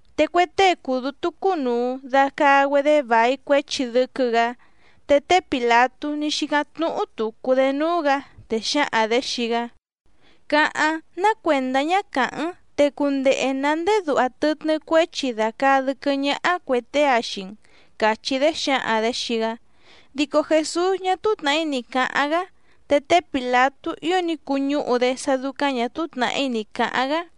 Te cue tée cùu dútú cúnùu dacaa‑güedé vài cuéchi dɨ́quɨ́‑gǎ. Te té Pìlatú ní xícáⁿ tnúhú tùcu‑dé núú‑gǎ, te xǎhaⁿ‑dě xii‑gá: —Cáháⁿ, ná cuèndá ñá càháⁿ‑n te cundehe nǎ ndéé duha tɨtnɨ́ cuéchi dàcaa dɨ́quɨ́ ñáhá cuè tée‑a xii‑n —càchí‑dé xǎhaⁿ‑dě xii‑gá. Dico Jèsús ñá túú tnàhí ni cǎháⁿ‑gá te té Pìlatú ío ní cuñúhu‑dé sá dúcáⁿ ñà túú tnàhí ni cǎháⁿ‑gá.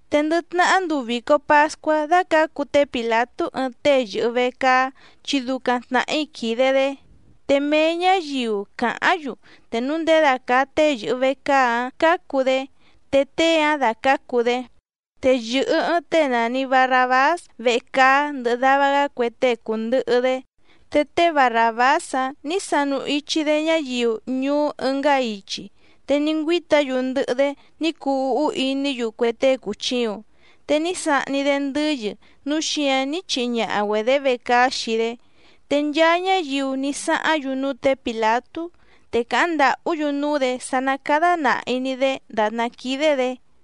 Te ndɨ tnahá nduu vìco pascuá dácǎcu té Pìlatú ɨɨⁿ tée yɨ̀hɨ vecaá chi ducaⁿ tnàhí quìde‑dé, te mee ñǎyiu càháⁿ‑yu te núu ndědacàa tée yɨ̀hɨ vecaá‑áⁿ cǎcu‑dé, te tée‑áⁿ dácǎcu‑dé. Te yɨ̀hɨ ɨɨⁿ tée nàni Barrabás vecaá ndɨhɨ dava‑gá cue tée cùndɨhɨ‑dé. Te té Barràbás‑áⁿ nǐ sanu ichi‑dé ñáyiu ñuú ɨngá ichi, te ní ngüíta‑yu ndɨhɨ‑dé ní cuu úhú iní‑yu cue tée cùchiuⁿ, te ní sahni‑dé ndɨ́yɨ núu xíǎⁿ ní chihi ñaha‑güedě vecaá xii‑dé. Te nchaa ñáyiu ní sáháⁿ‑yu núú tě Pìlatú, te càháⁿ ndàhú‑yu núú‑dě sá ná cádá nàhi‑ni‑dé dàtná quídé‑dě.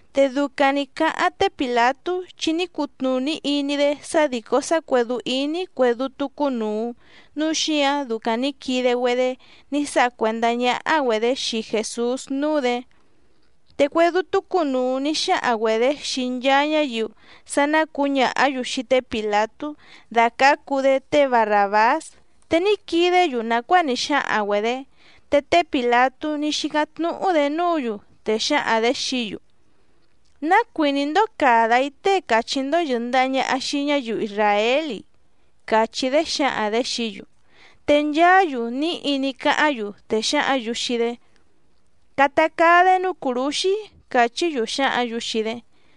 Te ducaⁿ nǐ cáháⁿ té Pìlatú, chi ní cutnùní iní‑dé sá dìcó sá cuèdú íní cuè dútú cúnùu núu xíǎⁿ ducaⁿ nǐ quide‑güedé ní sáha cuèndá ñáhá‑güedě xii Jèsús núú‑dě. Te cue dútú cúnùu ní xáhaⁿ‑güedě xii nchaa ñáyiu sá ná cǔñàhá‑yu xii té Pìlatú dàcácu‑dé té Barràbás, te ní quidé‑yu nàcuáa ní xáhaⁿ‑güedě. Te té Pìlatú ní xícáⁿ tnúhú‑dě núǔ‑yu, te xǎhaⁿ‑dě xií‑yu: —¿Ná cuìní‑ndó càda‑í tée càchí‑ndó yɨ̀ndaha ñaha xii ñáyiu isràél‑i? —càchí‑dé xǎhaⁿ‑dě xií‑yu. Te nchaá‑yu níhi ní cáháⁿ‑yu, te xǎhǎⁿ‑yu xii‑dé: —¡Cata caa‑dé núú cùrúxí! —càchí‑yu xǎhǎⁿ‑yu xii‑dé.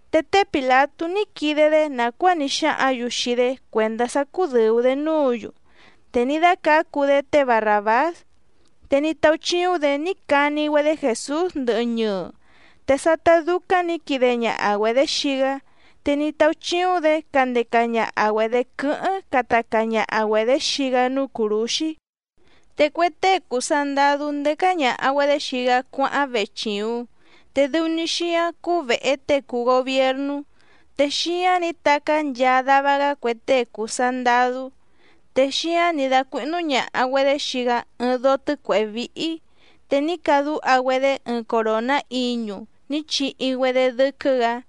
Te té Pìlatú ní quide‑dé nàcuáa ní xáhǎⁿ‑yu xii‑dé cuèndá sá cúdɨ̀u‑dé núǔ‑yu, te ní dácǎcu‑dé té Barràbás, te ní táúchíúⁿ‑dě ní cani‑güedé Jèsús ndɨhɨ ñɨɨ. Te sátá dúcáⁿ nǐ quide ñaha‑güedě xii‑gá, te ní táúchíúⁿ‑dě candeca ñaha‑güedě quɨ́hɨ́ⁿ cata caa ñaha‑güedě xii‑gá núú cùrúxí. Te cue tée cùu sandadú ndécá ñàha‑güedé xii‑gá cuáháⁿ vechìuⁿ, te dɨu‑ni xíáⁿ cúú vèhe tée cùu gobiernú. Te xíáⁿ nǐ tacá nchaa dava‑gá cue tée cùu sandadú. Te xíáⁿ nǐ dácuíhnú ñàha‑güedé xii‑gá ɨɨⁿ dóó tɨ̌cuèhé víhí, te ní cadúha‑güedé ɨɨⁿ coròná iñu ní chihi‑güedé dɨ́quɨ́‑gǎ.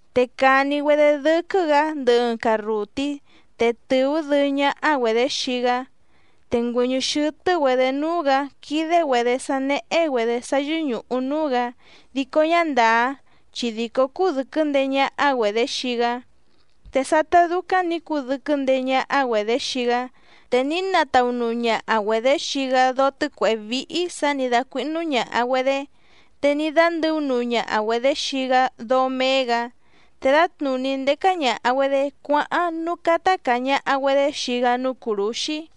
Te càni‑güedé dɨ́quɨ́‑gǎ ndɨhɨ ɨɨⁿ carrùtí, te tɨ̀ú dɨɨ́ ñáhá‑güedě xii‑gá, te ngüɨ̀ñɨ́ xɨ́tɨ́‑güedě núú‑gǎ quídé‑güedě sá néhé‑güedě sá yɨ́ñùhu núú‑gǎ dico ñá ndàá chi dìcó cúdɨ̀quɨ́ ndeé ñáhá‑güedě xii‑gá. Te sátá dúcáⁿ nǐ cudɨ́quɨ́ ndeé ñáhá‑güedě xii‑gá, te ní nataunuu ñaha‑güedě xii‑gá dóó tɨ̌cuèhé víhí sǎ nǐ dácuíhnú ñàha‑güedé, te ní dándɨ̌únuu ñaha‑güedě xii‑gá dóó méé‑gǎ. Te dǎtnùní ndécá ñàha‑güedé cuáháⁿ núú cátá càa ñaha‑güedé xii‑gá núú cùrúxí.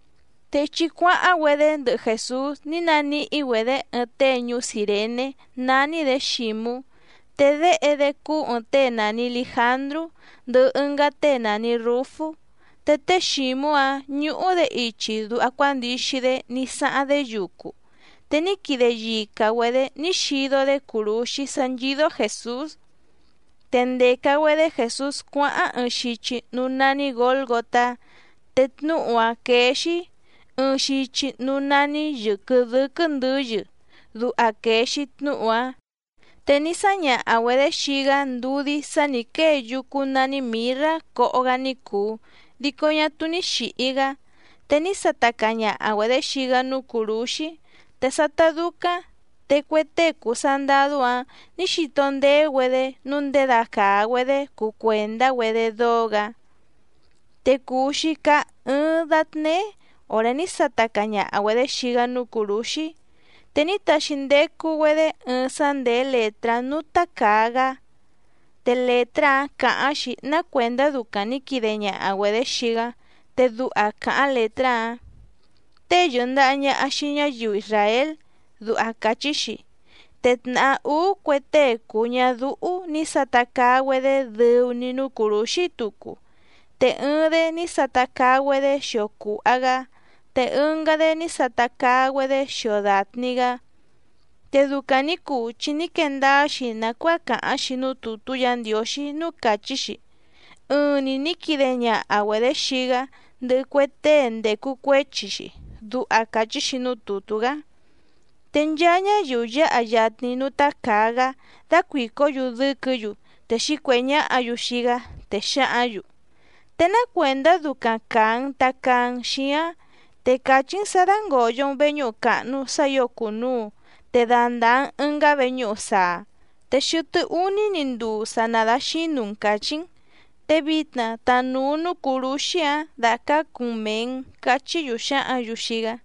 Te ichi cuáháⁿ‑güedé ndɨhɨ Jèsús ní naníhí‑güedě ɨɨⁿ tée ñuú Cìrené nání‑dě Xǐmú, te déhe‑dé cúú ɨ̀ɨⁿ tée nàni Lijandrú, ndɨhɨ ɨngá tée nàni Rúfú. Te té Xǐmú‑áⁿ ñúhú‑dě ichi duha cuándixi‑dé ní sáháⁿ‑dé yucu, te ní quide yica‑güedě ní xido‑dé cùrúxí sá nchídó Jèsús. Te ndèca‑güedé Jèsús cuáháⁿ ɨɨⁿ xichi núú nání Gǒlgotá, te tnúhu‑áⁿ quéé‑xí: Ɨɨⁿ xichi núú nání yɨ̀quɨ dɨ́quɨ́ ndɨ̌yɨ, duha quèe‑xi tnúhu‑áⁿ. Te ní sáñaha‑güedě xii‑gá ndudí sá nǐ quée yúcú nání mìrrá coho‑gá ní cùu dico ñá túú ní xìhi‑gá. Te ní sata caa ñaha‑güedě xii‑gá núú cùrúxí. Te sátá dúcáⁿ te cue tée cùu sandadú‑áⁿ nǐ xito ndeé‑güedé nǔu ndědacàa‑güedé cuu cuèndá‑güedé dóó‑gǎ. Te cùu‑xi caá ɨ́ɨ́ⁿ dátnéé òré ní sata caa ñaha‑güedě xii‑gá núú cùrúxí. Te ní taxi ndecu‑güedé ɨɨⁿ sá ndèé lètrá núú tácàa‑gá. Te lètrá‑áⁿ càháⁿ‑xi ná cuèndá ducaⁿ nǐ quide ñaha‑güedě xii‑gá. Te duha càháⁿ lètrá‑áⁿ: “Tée yɨ̀ndaha ñaha xii ñáyiu isràél”, duha càchí‑xi. Te tnàhá úú cue tée cùu ñadúhú nǐ sata caa‑güedé dɨu‑ni núú cùrúxí tucu. Te ɨɨⁿ‑dé ní sata caa‑güedé xio cùha‑gá, te ɨngá‑dé ní sata caa‑güedé xio dàtni‑gá. Te ducaⁿ nǐ cuu chi ní quee ndáá‑xi nàcuáa càháⁿ‑xi núú tùtú Yǎ Ndiǒxí núú càchí‑xi: “Ɨɨⁿ‑ni nǐ quide ñaha‑güedě xii‑gá ndɨhɨ cue tée ndècu cuéchi‑xi”, duha càchí‑xi núú tùtú‑gá. Te nchaa ñáyiu yǎha yatni núú tácàa‑gá dácuìcó‑yu dɨ́quɨ̌‑yu te xǐcuèhé ñáhǎ‑yu xii‑gá, te xǎhǎⁿ‑yu: —Te ná cuèndá ducaⁿ càa‑n tacaa‑n xíáⁿ, te càchí‑n sǎ dàngoyo‑n veñúhu càhnu sá ǐo cùnuu te dandàa‑n ɨngá veñúhu saa, te xɨtɨ́ úní‑ni nduu sa nadaxǐnu‑n càchí‑n. Te vitna tanùu núú cùrúxí‑áⁿ dàcácu‑n mèe‑n —cachí‑yu xǎhǎⁿ‑yu xii‑gá.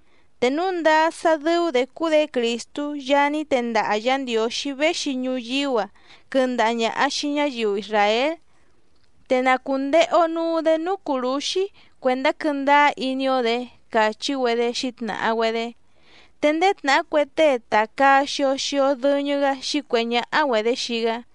Te núu ndáá sá dɨ́ú‑dě cúú‑dě Crìstú Yaá ní tendaha Yǎ Ndiǒxí véxi ñuyíú‑a quɨndaha ñàha xii ñáyiu isràél, te na cùndehe‑o nuu‑dé núú cùrúxí, cuèndá quɨ́ndáá iní‑ó‑dě —càchí‑güedé xǐtnàha‑güedé. Te ndéé tnàhá cue tée tàcaa xio xio dɨñɨ‑gá xǐcuèhé ñáhá‑güedě xii‑gá.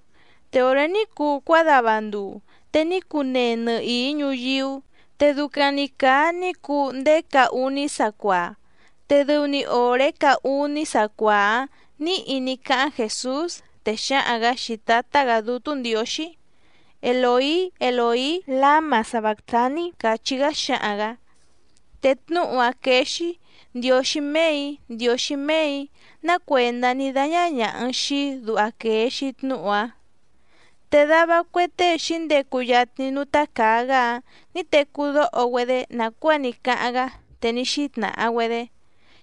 Te òré ní cuu cuádava nduu, te ní cunee nɨhìí ñuyíú, te ducaⁿ‑ni càa ní cuu ndéé caá úní sacuaa. Te dɨu‑ni òré caá úní sacuaa‑áⁿ nǐhi ní cáháⁿ Jèsús, te xǎhaⁿ‑gǎ xii Tǎtá‑gǎ Dútú Ndiǒxí: —Elòí, Elòí, láma sabàctaní —càchí‑gá xǎhaⁿ‑gǎ. Te tnúhu‑áⁿ quéé‑xí: Ndiǒxí méè‑í, Ndiǒxí méè‑í, ná cuèndá ní dáñá ñàha‑n xii‑í, duha quèe‑xi tnúhu‑áⁿ. Te dava cue tée xǐndecu yatni núú tácàa‑gá‑áⁿ nǐ tecú dóho‑güedé nàcuáa ní cáháⁿ‑gá, te ní xítnàha‑güedé: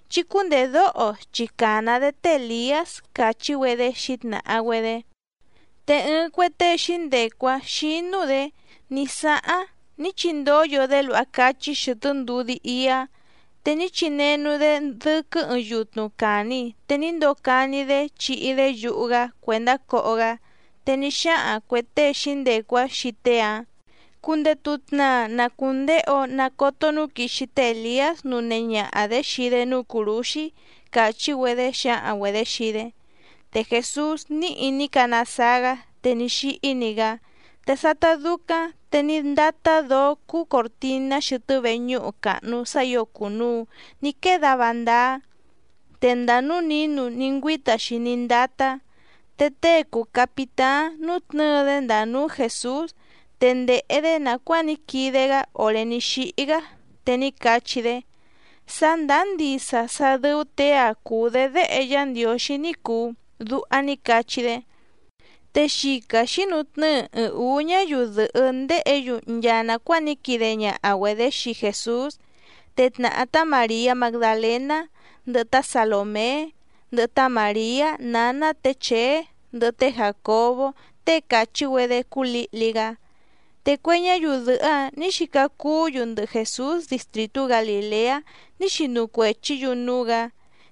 —Chí cúndèdóho chi càna‑dé té Èliás —càchí‑güedé xǐtnàha‑güedé. Te ɨɨⁿ cue tée xǐndecu‑áⁿ xínú‑dě ní sáháⁿ ní chindóyo‑dé luha cáchí xɨ̀tɨ́ ndudí íá, te ní chinenu‑dé dɨ́quɨ́ ɨɨⁿ yutnu càni te ní ndocani‑dé chíhí‑dě yuhu‑gá cuèndá coho‑gá. Te ní xáhaⁿ cuè tée xǐndecu‑áⁿ xii tée‑áⁿ: —Cundetu tnaa na cùndehe‑o nacoto núu quixi té Èliás nunehe ñaha‑dě xii‑dé núú cùrúxí —càchí‑güedé xǎhaⁿ‑güedě xii‑dé. Te Jèsús níhi ní canasaa‑gá te ní xíhí‑ni‑gá. Te sátá dúcáⁿ te ní ndátá dǒó cúú còrtiná xɨtɨ́ veñúhu càhnu sá ǐo cùnuu ní quée dava ndáá, te ndàa núú nǐnu ní ngüíta‑xi ní ndátá. Te tée cùu capitáⁿ nútnɨ̌ɨ‑dé ndàa núú Jèsús, te ndèhe‑dé nàcuáa ní quide‑gá òré ní xíhí‑gá, te ní cachí‑dé: —Sá ndàá ndisa sá dɨ́ú těe‑a cùu‑dé Déhe Yá Ndiǒxí ní cùu —duha ní cachí‑dé. Te xica xǐnutnɨ́ɨ ɨɨⁿ ǔú ñáyiu dɨ̀hɨ́ ndéhě‑yu nchaa nàcuáa ní quide ñaha‑güedě xii Jèsús, te tnàhá tá Màriá Magdalèná, ndɨhɨ tá Salòmé, ndɨhɨ tá Màriá nǎná tě Chèé ndɨhɨ té Jàcobó tée càchí‑güedé cúú lǐhli‑gá. Te cue ñáyiu dɨ̀hɨ́‑áⁿ nǐ xica cuú‑yu ndɨhɨ Jèsús distrìtú Galìleá ní xinu cuèchí‑yu núú‑gǎ.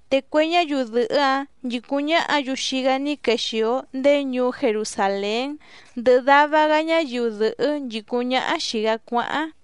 Te cue ñáyiu dɨ̀hɨ́‑áⁿ nchìcúⁿ ñáhǎ‑yu xii‑gá ní quexìo ndéé ñuú Jerusàlén ndɨhɨ dava‑gá ñáyiu dɨ̀hɨ́ nchìcúⁿ ñáhá xìi‑gá cuáháⁿ.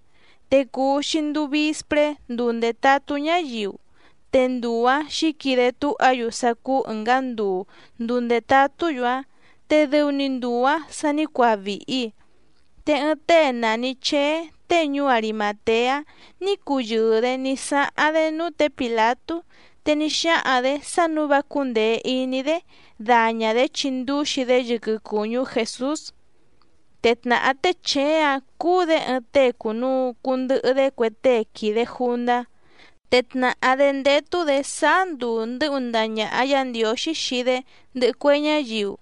Te cùu‑xi nduu vispré nduu ndètatú ñáyiu. Te nduu‑ǎⁿ xǐquide túha‑yu sá cúú ɨ̀ngá nduu nduu ndètatú‑yu‑áⁿ, te dɨu‑ni nduu‑ǎ sa ní cuaa vìhi, te ɨɨⁿ tée nàni Cheé tée ñuú Arimàteá ní cuyɨɨ‑dě ní sáháⁿ‑dé núú tě Pìlatú, te ní xáhaⁿ‑dě sá nǔu vá cúndèe iní‑dé daña‑dě chindúxi‑dé yɨquɨ cùñú Jèsús. Te tnàhá té Chèé‑áⁿ cúú‑dě ɨɨⁿ tée cùnuu cundɨhɨ‑dé cue tée quìde jundá, te tnàhá‑dé ndétú‑dě sáá nduu ndɨ́hu ndaha ñàha Yá Ndiǒxí xii‑dé ndɨhɨ cue ñáyiu.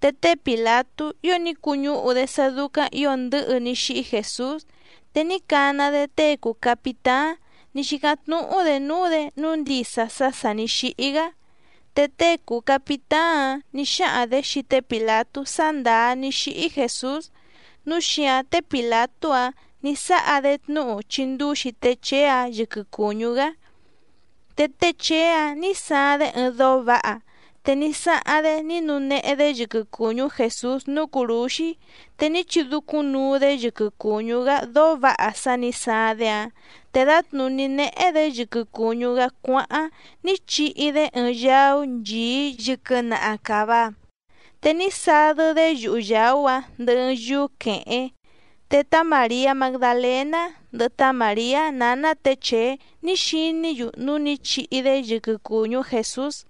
Te té Pìlatú ío ní cuñúhu‑dé sá dúcáⁿ ǐo ndɨ̌hɨ ní xíhí Jèsús, te ní cana‑dé tée cùu capitáⁿ ní xícáⁿ tnúhú‑dě núú‑dě nǔu ndisa sá sà ní xíhí‑gá. Te tée cùu capitáⁿ‑áⁿ nǐ xáhaⁿ‑dě xii té Pìlatú sá ndàá ní xíhí Jèsús, núu xíǎⁿ té Pìlatú‑áⁿ nǐ sáha‑dé tnúhu chindúxi té Chèé‑áⁿ yɨquɨ cùñú‑gá. Te té Chèé‑áⁿ nǐ saaⁿ‑dé ɨɨⁿ dóó vǎha, te ní sáháⁿ‑dé ní nunehe‑dé yɨquɨ cùñú Jèsús núú cùrúxí, te ní chidúcúⁿnuu‑dé yɨquɨ cùñú‑gá dóó vǎha sá nǐ saaⁿ‑dé‑áⁿ, te dǎtnùní néhé‑dě yɨquɨ cùñú‑gá cuáháⁿ ní chihi‑dé ɨɨⁿ yaú nchìí yɨquɨ naha càva, te ní sadɨ́‑dé yuhu yàú‑áⁿ ndɨhɨ ɨɨⁿ yúú quèhéⁿ. Te tá Màriá Magdalèná, ndɨhɨ tá Màriá nǎná tě Chèé ní xiní‑yu núú nǐ chihi‑dé yɨquɨ cùñú Jèsús.